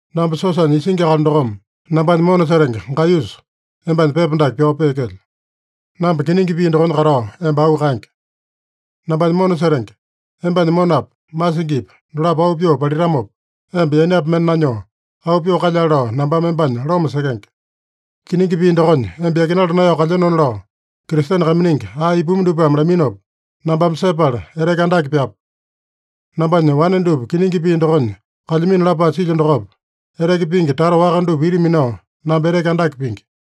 Namba siosanya isingi akali dokome nambanya mona setenge Gaiyusa, embanya pepa dake pyao peekelyo. Namba kiningi pii dokonya katao emba auu kaenge. Nambanya mona setenge, embanya monapa, masingipa dolapo auu pyoo palitamopa, emba yainapi mende nanyoo, auu pyoo kalyale lao nambame embanya loma sekenge. Kiningi pii dokonya emba yakinala naeyao kalyenona lao Kristene kaiminingi ae ipumi dupame laminopa nambame sepala, eteke andake pyapu. Nambanya wane dupa kiningi pii dokonya kalyamino lapae silyo dokopa, eteke pingi tata waka dupa ita minao namba eteke andake pingi.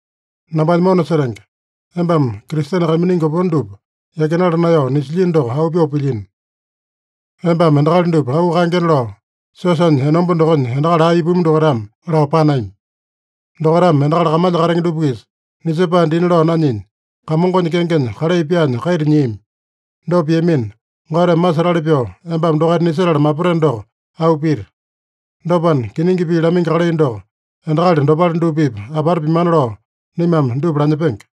Nambanya mona setenge, embame Kristene kaiminingi opone dupa yakinala naeyao nisilyino doko, auu pyoo pilyino. Embame endakali dupa auu kaengena lao, siosanya enomba dokonya endakali ae ipumi dokaitame lao panami. Dokaitame endakali kamalya katenge dupa-kisa nisepae dina lao nanyinya, Kamongonya kengenya kalai pyaanya kaita nyiami. Dopa piamina, Goteme masetali pyoo embame dokaita nisetala mapateno doko auu pita. Dopana, kiningi pii lamaingi kalai doko endakali dopale dupa-pipa apata pimana lao, naimame dupa lanyepenge.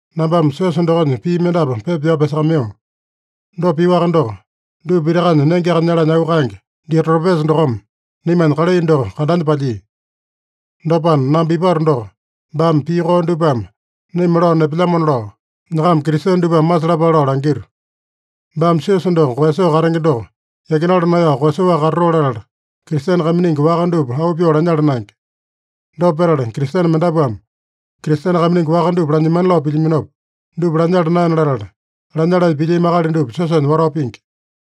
Nambame siosa dokonya pii mendapu pepa pyao pyasakamaiyo. Dopa pioaka doko, dupa pitakanya nengeaka nyalanya auu kaenge, Diotrepesa dokome naimanya kalai doko kandanya palyia. Dopana, namba ipato doko, baame pii koo dupame naima lao nepelyamona lao, nyakama Kristene dupame masalapale lao langito. Baame siosa doko koeyasoo katenge doko yakinala naeyao koeyasoaka katatoo latala, Kristene kaiminingi waka dupa auu pyoo lanyala naenge. Dopa petala, Kristene mendapuame Kristene kaiminingi waka dupa lanyemana lao pilyaminopa, dupa lanyala naena latala, lanyalanya pilyami akali dupa siosanya watao pingi.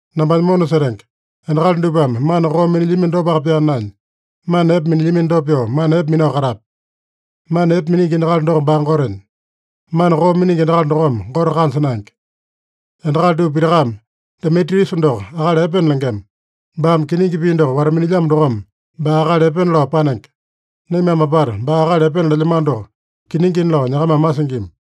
Nambanya mona setenge, endakali dupame mana koo minilyamino dopaka pyaa naenya, mana epe minilyamino dopa pyoo mana epe minao katape. Mana epe miningi endakali doko baa Gotenya. Mana koo miningi endakali dokome Gote kanja naenge. Endakali dupa pitakame Demitriusa doko akali epena lengema. Baame kiningi pii doko wata-minilyamo dokome, baa akali epena lao panenge. Naimame apata baa akali epena lelyamano doko kiningina lao nyakamame masingima.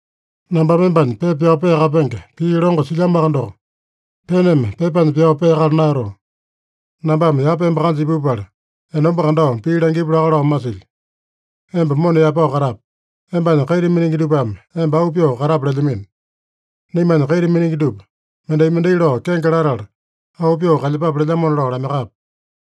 Nambame embanya pepa pyao peakapenge pii longo silyamoaka doko, peneme pepanya pyao peakala naeyatoo. Nambame yapa emba kanja ipupala, enomba kandao pii langipu laka lao masilyo. Emba mona yaepao katape. Embanya kaita miningi dupame emba auu pyoo katape lelyamino. Naimanya kaita miningi dupa, mendai-mendai lao kenge latala, auu pyoo kalyepape lelyamona lao lamaiyakape.